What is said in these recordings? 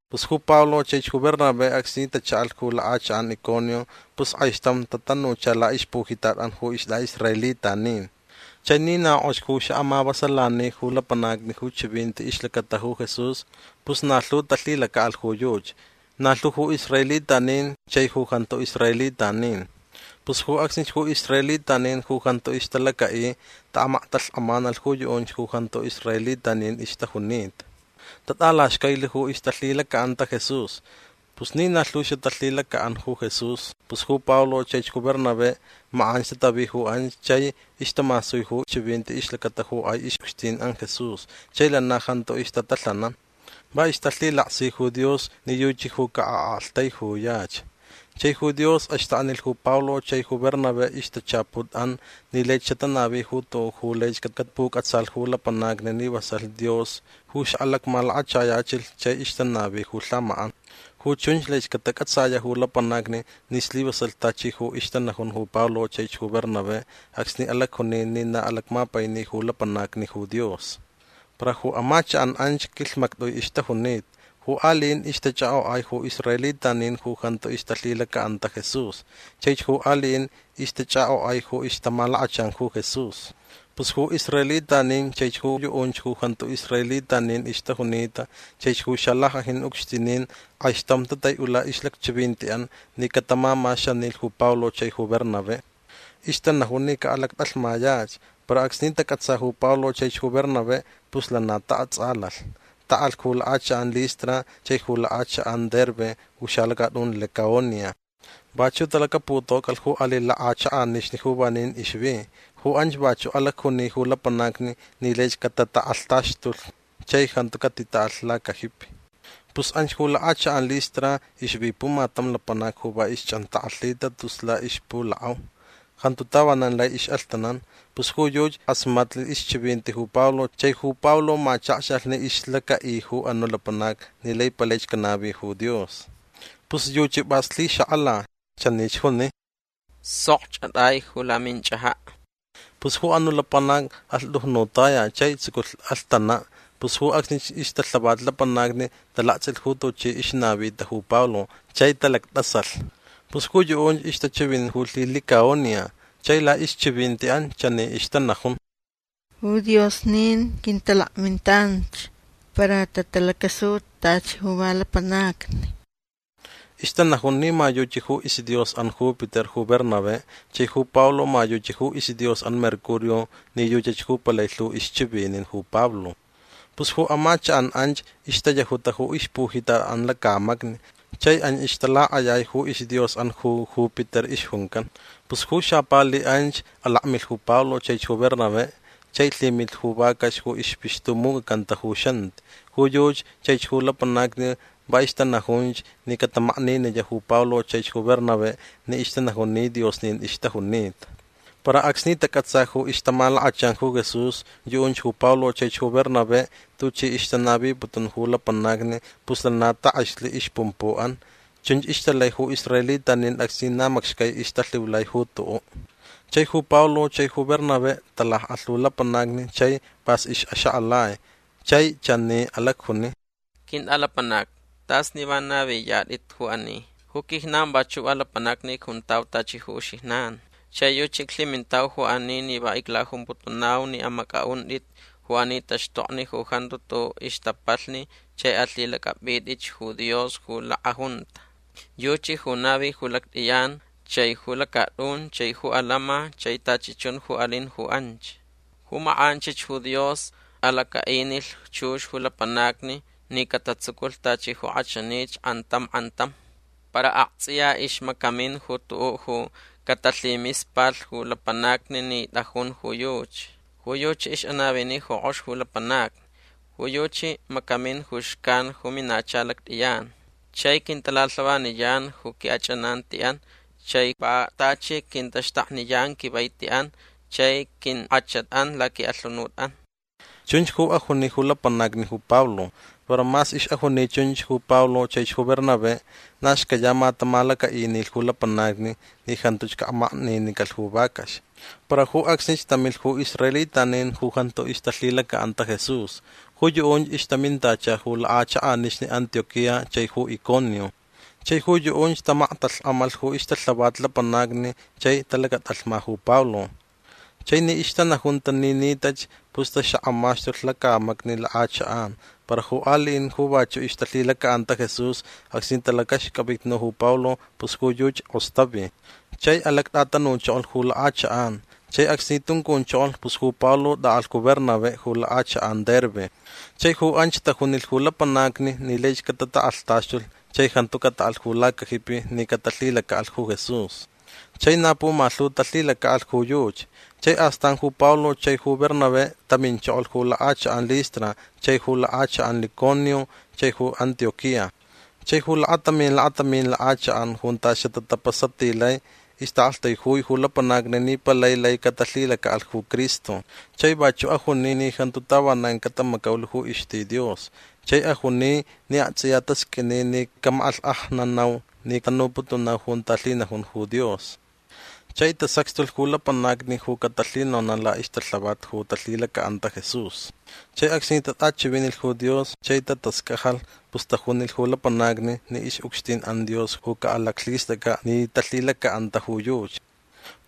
Pus ju Pablo chaich ju Bernabé acsni tachaʼalh ju lakʼachakʼan Iconio pus kʼaixtam tatanucha laʼixpujitatʼan ju istʼaʼisraelitanin. Chai ni na kʼox ju xaʼamavasalani ju lapanacni ju chivinti ixlacata ju Jesús pus na lhu talhilacaʼalh ju yuchi. Na lhu ju israelitanin chai ju jantu israelitanin. Pus ju acsnich ju israelitanin ju jantu ixtalacaʼi taʼamaktalhkʼamanalh ju yuʼunch ju jantu israelitanin ixtajunita. Tatʼalaxcailich ju ixtalhilacaʼanta Jesús. Pus ni na lhu xatalhilacaʼan ju Jesús pus ju Pablo chaich ju Bernabé makʼanch tatavi ju anch chai ixtamasui ju chivinti ixlacata ju kʼai ixʼucxtinʼan Jesús chai lana jantu ixtatalhanan. Va ixtalhilaksi ju Dios ni yuchi ju caʼaʼaktaijuyach. Chai ju Dios axtaknilh ju Pablo chai ju Bernabé ixtachaputʼan ni lai xatanavi ju tuʼuʼ ju laich catapucʼatsalh ju lapanacni ni vasalh Dios ju xaʼalacmalakachayachilh chai ixtanavi ju lhamakʼan. Ju chunch laich catacʼatsayaʼ ju lapanacni ni slivasalh tachi ju ixtanajun ju Pablo chaich ju Bernabé acsni alacjuni ni na alacmapaini ju lapanacni ju Dios. Para ju amachakʼan anch quilhmactʼui ixtajunita. Ju aliʼin ixtachʼakʼokʼai ju israelitanin ju jantu ixtalhilacaʼanta Jesús. Chaich ju aliʼin ixtachʼakʼokʼai ju ixtamalakachan ju Jesús. Pus ju israelitanin chaich ju yuʼunch ju jantu israelitanin ixtajunita chaich ju xalackʼajin ucxtinin kʼaixtam tataiʼula ixlacchivintiʼan ni catamamaxanilh ju Pablo chai Bernabé. Ixtanajun ni caʼalacatʼalhmayach. Para acsni tacʼatsa ju Pablo chaich ju Bernabé pus lana taʼatsʼalalh. Taʼalh ju lakʼachakʼan Listra chai ju lakʼachakʼan Derbe ju xalacatʼun Licaonia. Vachuʼ talacaputocʼalh ju aliʼ lakʼachakʼanixni ju vanin ixvi. Ju anchach vachuʼ alacjuni ju lapanacni ni laich catatakʼalhtaxtulh chai jantu catitaʼalh ju lacajipi. Pus anch ju lakʼachakʼan Listra ixvi pumatam lapanac ju va ixchʼantakʼalhita tus laʼixpulakʼau. Jantu tavanan lai ixʼalhtanan. Pus ju yuchi kʼasmatnilh ixchivinti ju Pablo chai ju Pablo machakxalh ni ixlacaʼi ju anuʼ lapanac ni lai palaich canavi ju Dios. Pus yuchi pʼas lhixakʼala. Chanich juni: ―Sokch atʼai ju laminchʼajaʼ. Pus ju anuʼ lapanac alhtujnutaya chai tsuculh alhtanan. Pus ju acsnich ixtalhavat lapanacni talaktsʼilh ju tuchi ixnavita ju Pablo chai talactʼasalh. Pus ju yuʼunch ixtachivinin ju lhilicaonia. Chai laʼixchivintiʼan chani ixtanajun: ―Ju diosnin quintalakmintanch para tatalacasuta tachi ju va lapanacni. Ixtanajun ni ma yuchi ju isdiosʼan Júpiter ju Bernabé chai ju Pablo ma yuchi ju isdiosʼan Mercurio ni yuchach ju palai lhu ixchivinin ju Pablo. Pus ju amachakʼan anch ixtayajuta ju ixpujitatʼan lacamacni chai anch ixtalakʼayai ju isdiosʼan ju Júpiter ixjuncan. Pus ju xapali anch alakmilh ju Pablo chaich ju Bernabé chai lhimilh ju vacax ju ixpixtumucʼacanta ju xanti. Ju yuchi chaich ju lapanacni va ixtanajunch ni catamakniniyaʼ ju Pablo chaich ju Bernabé ni ixtanajun ni diosnin ixtajunita. Para acsni tacʼatsa ju ixtamalakachan ju Jesús yuʼunch ju Pablo chaich ju Bernabé tuchi ixtanaviputun ju lapanacni pus lana takʼexlh ixpumpuʼan. Chunch ixtalai ju israelitanin acsni na macxcai ixtalhiulai ju tuʼuʼ. Chai ju Pablo chai ju Bernabé talakʼalh ju lapanacni chai pʼas ixʼaxakʼalai. Chai chani alacjuni: ―Quintʼalapanacni tʼas ni va naviyatʼit ju ani. Ju quijnan vachuʼ va lapanacni icjuntau tachi ju uxijnan. Chai yuchi iclhimintau ju ani ni va iclajumputunau ni amacʼaʼuntʼit ju ani taxtokni ju jantu tuʼuʼ ixtapalhni chai alhilacʼapʼitʼitch ju Dios ju lakʼajunta. Yuchi ju navilh ju lactʼiyan chai ju lacatʼun chai ju alama chai tachi chun ju alin ju anch. Ju makʼanchich ju Dios alacaʼinilh chux ju lapanacni ni catatsuculh tachi ju kʼachanich kʼantam kʼantam. Para aktsʼiya ixmacamin ju tuʼuʼ ju catalhimispalh ju lapanacni ni tʼajun ju yuchi. Ju yuchi ixʼanavini kʼox ju lapanacni. Ju yuchi macamin ju xcan ju minacha lactʼiyan. Chai quintalalhavaniyan ju quiʼachʼanantiʼan chai va tachi quintaxtakniyan quivaitiʼan chai quinkʼachatʼan laquiʼalhunutʼan. ―Chunch ju ajuni ju lapanacni ju Pablo. Para mas ixʼajuni chunch ju Pablo chaich ju Bernabé na xcayama tamalacaʼinilh ju lapanacni ni jantuch caʼamakninicalh ju vacax. Para ju acsnich tamilh ju israelitanin ju jantu ixtalhilacaʼanta Jesús. Ju yuʼunch ixtamintacha ju lakʼachakʼanixni Antioquía chai ju Iconio. Chai ju yuʼunch tamaktalhkʼamalh ju ixtalhavat lapanacni chai talacatʼalhma ju Pablo. Chai ni ixtanajunta ni nitach pus taxakʼamaxtulh lacamacni lakʼachakʼan. Para ju aliʼin ju vachuʼ ixtalhilacaʼanta Jesús acsni talacaxcʼavitnu ju Pablo pus ju yuchi kʼostavi. Chai alactʼatanuchokolh ju lakʼachakʼan. Chai acsni tuncunchokolh pus ju Pablo tʼaʼalh ju Bernabé ju lakʼachakʼan Derbe. Chai ju anch tajunilh ju lapanacni ni laich catatakʼalhtaxtulh chai jantu cataʼalh ju lacajipi ni catalhilacaʼalh ju Jesús. Chai na pumalhu talhilacaʼalh ju yuchi. Chai astan ju Pablo chai ju Bernabé taminchokolh ju lakʼachakʼan Listra chai ju lakʼachakʼan Iconio chai ju Antioquía. Chai ju lakatamin lakatamin lakʼachakʼan junta xatatapasatilai ixtaʼaʼaktaijui ju lapanacni ni palai lai catalhilacaʼalh ju Cristo. Chai vachuʼ ajuni ni jantu tavanan catamacaulh ju ixti Dios. Chai ajuni ni aktsʼiya tasqʼuini ni camakʼalhkʼajnanau ni tanuputunau junta lhinajun ju Dios. Chai tasacxtulh ju lapanacni ju catalhinonaʼ laʼixtalhavat ju talhilacaʼanta ju Jesús. Chai acsni tatʼachivinilh ju Dios chai tatascajalh pus tajunilh ju lapanacni ni ixʼucxtinʼan Dios ju caʼalaclhistʼacʼaʼ ni talhilacaʼanta ju yuchi.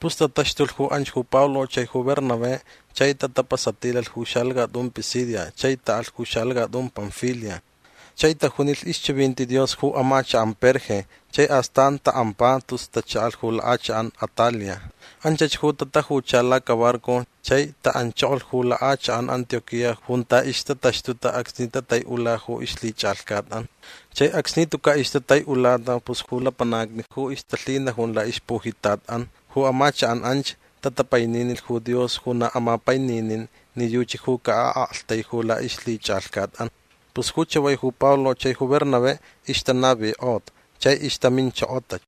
Pus tataxtulh ju anch ju Pablo chai ju Bernabé chai tatapasatilalh ju xalacatʼun Pisidia chai taʼalh ju xalacatʼun Panfilia. Chai tajunilh ixchivinti Dios ju amachakʼan Perge chai astan taʼampa tus tachaʼalh ju lakʼachakʼan Atalia. Anchach ju tajucha lacabarco chai taʼanchokolh ju lakʼachakʼan Antioquía junta ixtataxtuta acsni tataiʼula ju ixlhichʼalhcatʼan. Chai acsni tucaʼ ixtataiʼulata pus ju lapanacni ju ixtalhinajun laʼixpujitatʼan ju amachakʼan anch tatapaininilh ju Dios ju na amapaininin ni yuchi ju caʼaʼaktaiju laʼixlhichʼalhcatʼan. Pus ju chavai ju Pablo chai ju Bernabé ixtanavikʼota chai ixtaminchokota.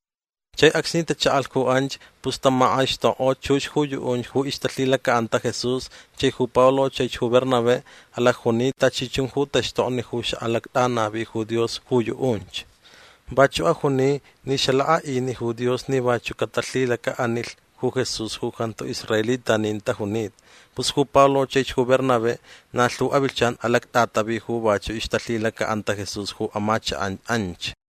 Chai acsni tachaʼalh ju anch pus tamakʼaixtokkʼo chux ju yuʼunch ju ixtalhilacaʼanta Jesús chai ju Pablo chaich ju Bernabé alacjuni tachi chun ju taxtokni ju xaʼalactʼanavi ju Dios ju yuʼunch. Vachuʼ ajuni ni xalakʼaʼini ju Dios ni vachuʼ catalhilacaʼanilh ju Jesús ju jantu israelitanin tajunita. Pus ju Pablo chaich ju Bernabé na lhu avilhchan alactʼatavi ju vachuʼ ixtalhilacaʼanta Jesús ju amachakʼan anch.